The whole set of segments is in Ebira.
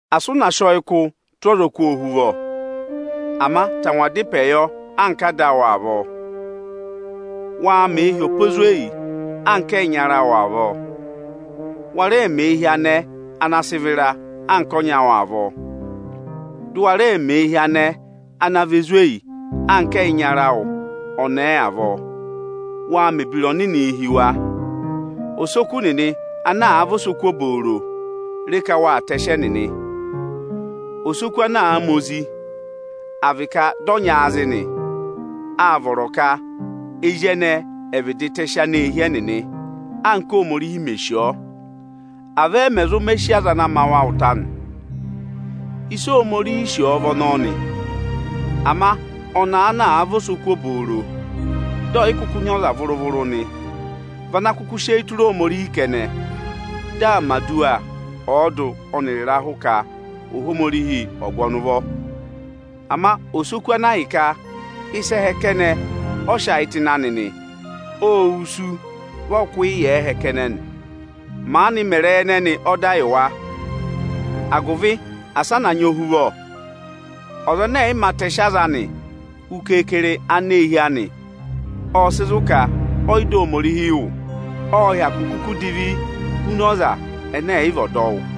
Asị ụ na sị ọyịkụ tụ́ ọzọkụ ohuvọ! Ama tangwaa dá ịpẹẹ yọ anka ada awụ avọọ! Waa mẹẹ hi ọpa ezweyi anka ẹyịnyara awụ avọọ! Wa rẹẹ mẹẹ hi anẹẹ ana sị vịra anka ọnyị awụ avọọ, dụ wa rẹẹ mẹẹ hi anẹẹ ana vị ezweyi anka ẹyịnyara awụ ọnẹẹ avọọ! Waa mẹ̀ ebira ọnịnịị hi wa! Osoku nịnị ana àa vị osoku obooro, re ka waa tẹsị ẹnịnị! Osoku ana àa ma ozi, à vị ka dị ọ nyị aazị nị, áa vọrọ ka ezi ẹnẹẹ ẹ̀ vịdị tẹsị aneehi ẹnịnị, anka Óhomorihi mè sì ọọ. Avọọ ẹ mẹ̀ zụ mẹ sí aza ana ma wa ụta nị. Ịsị Ohomorihi sì ọ vị ọnọọ nị. Ama ọnẹẹ ana àa vị osoku obooro, dị ọ̀ yị kụkụ nyị ọza vụrụ-vụrụ nị, vị ana kụkụ sị eyi tụra Ohomorihi kẹnẹ; dị aa mẹ̀ aduwa ọọdụ ọnịrị ịrahụ ka Ohomorihi ọ̀ọ gụ ọnị ụvọ. Ama osoku ana ahịka ịsa ẹhẹ kẹnẹ ọ sị ayị tụ́ ịnị anị, óo wusu, vị ọ kụkụ yà ẹhẹ kẹnẹ nị. Maanị mẹ ịrẹyị ẹnẹnị ọda yị wa, agụvị asị ẹ na nyị ohuvọ! Ọza ẹnẹ ẹ̀yị mā tẹsị aza anị, hu keekere aneehi anị, ọ́ọ sị zụ̀ ka ọyị dọ Ohomorihi wụ́. Ọ́ọ hyakụ kuku divi huna ọza ẹnẹ ẹ̀ yị vị ọdọwụ.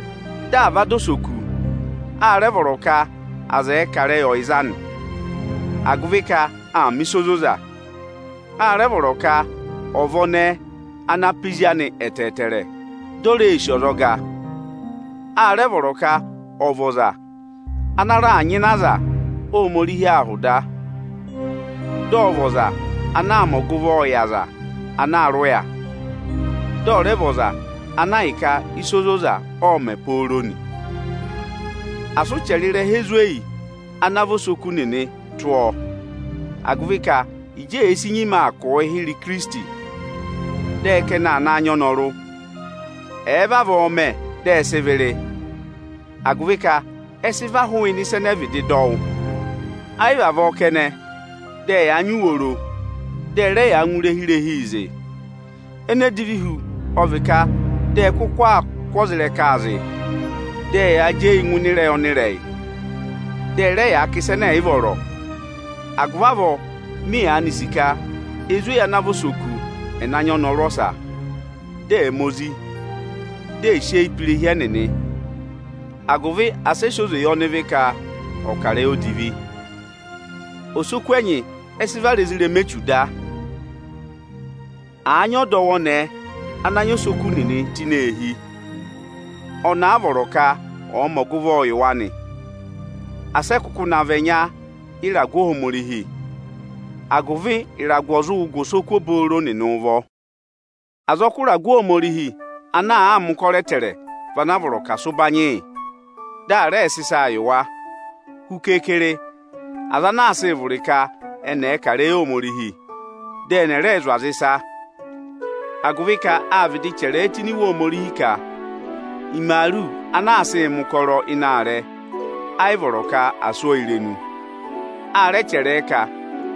Dị à va dọ osoku, a rẹ vọrọ ka aza ẹ̀ẹ kà ịrẹyị ọyịza anị, agụvị ka aa mẹ̀ ịsa ozoza. A rẹ vọrọ ka ọ̀ vị ọnẹẹ ana pá ezi anị ẹtẹẹtẹrẹ, dị ò reē sì ọzọga. A rẹ vọrọ ka ọ̀ vị ọza ana raà nyịna aza Ohomorihi ahụ da, dị ọ̀ vị ọza anaā mẹ ọgụvọọ yị aza ana aa rị ụya, dị ọ̀ rẹ vị ọza ana ahịka ịsa ozoza ọọ̄ mẹ̀ pooro nị. Asị ụ chẹrẹ ịrẹha ezweyi ana vị osoku nịnị tụ́ ọọ, agụvị ka Ịjị èe si nyima aa kụ̀ụ hịrẹ Ikirisiti, dị ẹ ka ẹnị aa naa nyị ọnọrụ. Ẹ̀ẹ vavọọ mẹ, dị ẹ sị ịvị rị, agụvị ka ẹ sị và hụụnị ịsa ẹnẹẹ vịdị dọ wụ́. Ẹ yị vị avọọ kẹnẹ, dị ẹyaa nyị uworo, dị ẹ rẹ yaa ngụ irehi-irehii zị. Ene divi hu ọ vị ka, dị ẹ kụkụ aa kụ́ ọza ịrẹkaa zị, dị ẹyaa jị eyii ngụ ịnị ịrẹyị ọnịrẹyị, dị ẹ rẹ yaa kà ịsa ẹnẹ ẹ̀ yị vọrọ. Agụvị avọọ, mị yaanị sì ka ezweyi ana àa vị osoku, ẹ̀ na nyị ọnọrụ ọsa, dị ẹ̀ ma ozi, dị ẹ̀ sị eyi pe irehi ẹnịnị, agụvị asị ẹ sị oze yị ọnịvị ka ọ̀ọ kà ịrẹyị odivi. Osoku ẹnyị ẹ sị vara ezirẹma Echu da. Àa nyị ọdọwụ ọnẹẹ ana nyị osoku nịnị tụ́ ini eehi, ọnị a vọrọ ka ọ̀ọ mẹ ọgụvọ yị wa nị. Asị ẹ kụkụ na vị ẹnya yị ịragụ Ohomorihi, agụvị ịragụ ọ̀ zụ gụ osoku obooro nịnị ụvọ! Azọkụ ịragụ Ohomorihi ana àa mẹ̀ ụkọrọ ẹtẹẹrẹ, vị ana a vọrọ ka à sị ụbanyị yị, dị à rẹẹ sị ịsaa yị wa; hu keekere, aza ana aa sịị vụrị ka ẹnị ẹ̀ẹ kà ịrẹyị Ohomorihi, dị ẹnị ẹ̀ rẹẹ zụ̀ aza ịsa. Agụvị ka áa vịdị chẹrẹ ẹ tụ́ ini Iwe Ohomorihi ka, “Imaaru ana aa sịị mẹ̀ ụkọrọ ịnị aarẹ, ẹ yị vọrọ ka à sụ́ ọọ irenu.” A rẹ chẹrẹ ẹ ka,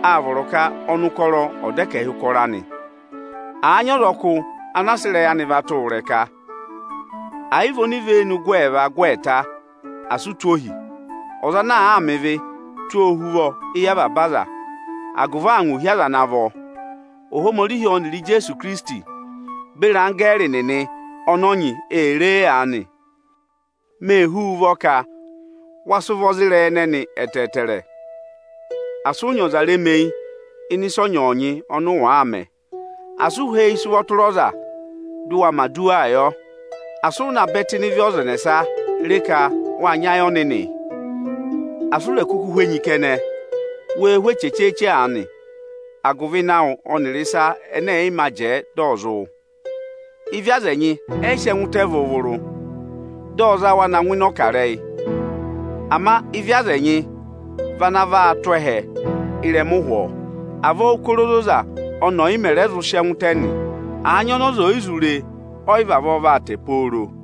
“Aa vọrọ ka ọnụkọrọ ọ̀ dọ ẹkẹhị ụkọrọ anị.” Àa nyị ọzọkụ ana sị ịrẹyị anị va tụ́ wụ ịrẹka, àa yị vị onivenu gụ ẹẹva, gụ ẹẹta, asị ụ tụ́ ohi! Ọza ana àaa mẹ ịvị, tụ́ ọọ ohuvọ éyi avaba aza, agụvị angwa ò hí aza ana vọ. Ohomorihi ọnịrị Ijeesu Ikirisiti beri anggẹẹrị nịnị ọnị ọ nyị ee ree aanị; mee hú wu ụvọ ka wa sị ụvọ za ịrẹyị ẹnẹnị ẹtẹẹtẹrẹ! Asị ụ nyị ọza remeyi ịnị ịsa ọnyọọnyị ọnị ụ wàaa mẹ. Asị ụ há eyi sị ụvọ tụra ọza, dị ụ wa mẹ̀ aduwaa yọ. Asị ụ na bẹ tụ́ ịnị ịvị ọza ẹnẹsa! Re ka wáa nyị ayị ọnịnị! Asị u rè kuku hú enyi kẹnẹ, wee hú eche chee-chee aanị agụvị ịnẹ awụ ọnịrị ịsa, ẹnẹ ẹ̀yị mā jẹẹ dị ọ̀ zị wụ. Ịvị aza ẹnyị ẹ yị sị ẹngụ tẹ vụrụ-vụrụ, dị ọ za wa na ngụ ịnị ọkarẹyị. Ama ịvị aza ẹnyị vị ana vaa tụ́ ẹhẹ ị́rẹma ụhwọọ. Avọọ ụ́kọrọ ozoza ọnị ọ̀yị mẹ̀ rẹ zụ sị ẹngụ tẹ nị. Àa nyị ọnị ọza ọyị zụ re, ọyị vavọọ vaa tẹ pooro.